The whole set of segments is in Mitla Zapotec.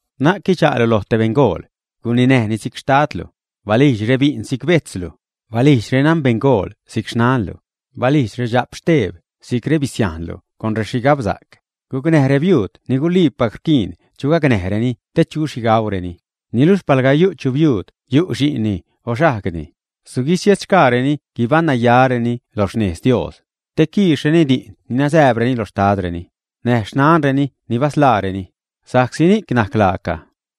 Na'c quidxa'lu loj te beṉgool; guninäjni si'c xtadlu, balijdx rebi'n si'c bejtzlu, balijdx renanbeṉgool si'c xnanlu, balijdx redxap steeb si'c rebisiajnlu con rexhigabsa'c. Gucnäj rebiuud ni guliipac rquiin chu gacnäjreni te chu xhi gaureni. Niluxh palga yu' chu biuud yu' xi'nni o xajgni, suguisiedxgaareni guibaṉ nayareni lo xnez Dios, te quiixreni di'n ni nasääbreni lo xtadreni, näj xnanreni ni basḻaareni, sa'csi ni'c najc laaca,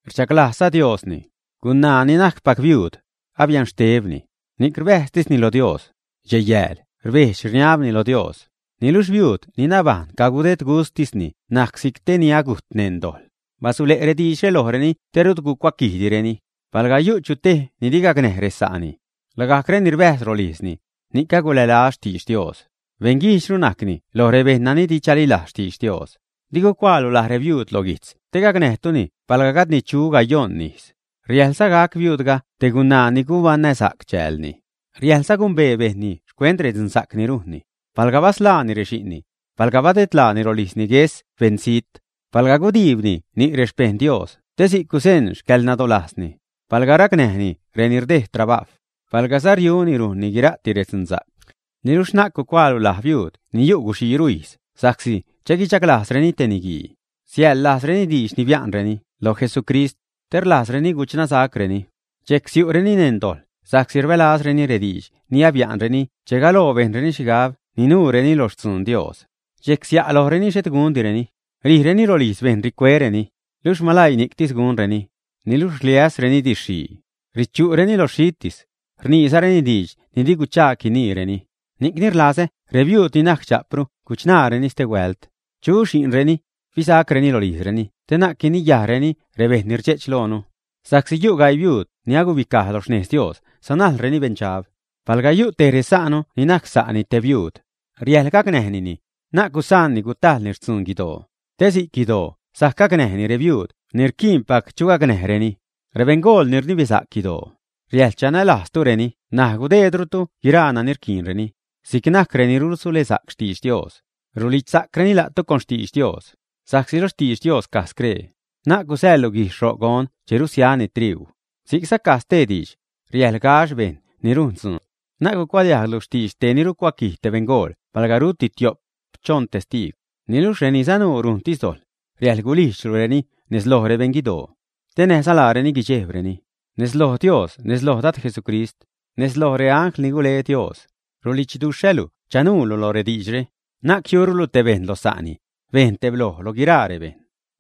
rdxaglajzza Diosni. Gunaa ni najcpac biuud, abia'n xtebni, ni'c rbäjztisni lo Dios, dxej-yääl rbejdx-rniabni lo Dios. Niluxh biuud ni nabajṉ cadedgustisni najc si'c te ni agujt neṉ dojḻ. Basule' rediidxre lojreni te rut gucuaquijdireni. Palga yu' chutej ni di gacnäj resa'ni, lagajc reni rbäjz rolijzni, ni'c agulälaz xtidx Dios, beṉguijdxru najcni lo rebejṉ nani di chalilajz xtidx Dios. Di gucuaalu laj rebiuud lo guijtz te gacnäjtuni palga gajdni chu gayojṉ ijz. Riäjḻza gac biuudga te gunaa ni gubaṉnäsa'c chäälni. Riäjḻza gumbee bejṉni xcuent redzunsa'c ni rujnni; palga basḻaani rexi'nni, palga badedlaani rolijzni gues beṉ zijt, palga gudiibni ni' rexpejṉ Dios te si'c guzeṉ xcäḻnadolajzni, palga racnäjni reni rdejd trabajw, palgaza riuni rujnni guira'ti redzunsa'c. Niluxh na'c gucuaalu laj biuud ni yu' guxiiru ijz sa'csi che guichaglajzreni te niguii, siäḻlajzreni diidx ni bia'nreni lo Jesucrist, te rlajzni guchṉasacreni. Dxejc siu'reni neṉ dojḻ sa'csi rbälazreni rediidx ni bia'nreni che galoo bejnreni xhigab ninuureni lo xtzuun Dios. Dxejc sia' lojreni xhet gundireni, rijreni rolijz bejṉ ricuereni. Luxh malaii ni'ctis gunreni. Niluxh rliäszareni didxxhii, richu'reni lo xhitis, rniizareni diidx ni di guchaag guiniireni. Ni'cni rlazä rebiuud ni najc dxa'pru guchṉaareni stehuält, chu xi'nreni, fisa'creni rolijzreni te na'c guiniyajreni rebejṉ ni rdxe'ch lojnu. Sa'csi yu' gaii biuud ni alagubicaj lo xnez Dios sanajlreni beṉdxab. Pal yu' tej resa'nu ni najc sa'ni te biuud, riäjḻ gacnäjnini, na'c gusaanni gutajlni xtzuun guidoo, te si'c guidoo sajc gacnäj rebiuud ni rquiinpac chu gacnäjreni. Rebeṉgool ni rnibesa'c guidoo, riäjḻ chanälajzrutureni näj gudeedrutu guiraa nani rquiinreni, si'c najc reni rusulesa'c xtidx Dios, rulidxsa'creni la'tu con xtidx Dios. Sa'csi lo xtidx Dios caj scree: “Na'c gusäḻlu guijxh ro' gon che rusiani triuu”; si'cza caj stee diidx: “Riäjḻ gax bejṉ ni rujn dzuun.” Na'c cucuadiajglu xtidx tej ni rucuaquij te beṉgool palga ruti tio'p, choṉ testiigw. Niluxh reni sanuu rujntis dojḻ, riäjḻ gulijdxlureni nez loj rebeṉ guidoo, te näjza laareni guidxejbreni. Nez loj Dios, nez loj Dad Jesucrist, nez lojza reangl ni gule Dios, rulidxduxhälu chanuulu lo rediidxre, na'c jiurulu tej bejṉ lo sa'ni. Bejn tebloj loj guiraa rebejṉ.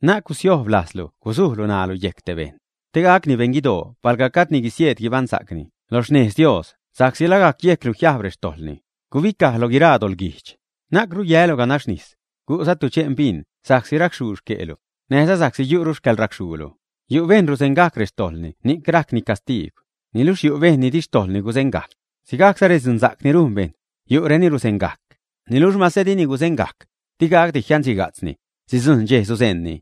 Na'c gusiojb lajzlu gusujlu ṉaalu yejc te bejṉ, te gacni beṉ guidoo palga gajdni guisieed guibaṉsa'cni lo xnez Dios sa'csi lagajc yejclu jiajb rextojḻni. Gubicaj lo guiraa doḻguijdx. Na'cru yälu ganax nis. Gu'za tudxe'n bin sa'csi racxhuu xque'lu, näjza sa'csi yu'ru rexcäḻracxhuulu. Yu' bejṉ ruzeṉgajc rextojḻni ni'c rajcni castiigw, niluxh yu' bejṉ ni di xtojḻni guzeṉgajc. Sigajcsa redzunsa'c ni rujn bejṉ; yu'reni ruzeṉgajc, niluxh mase dini guzeṉgajc, digacdi jianxhiga'tzni, sidzujṉ dxej suzeṉni.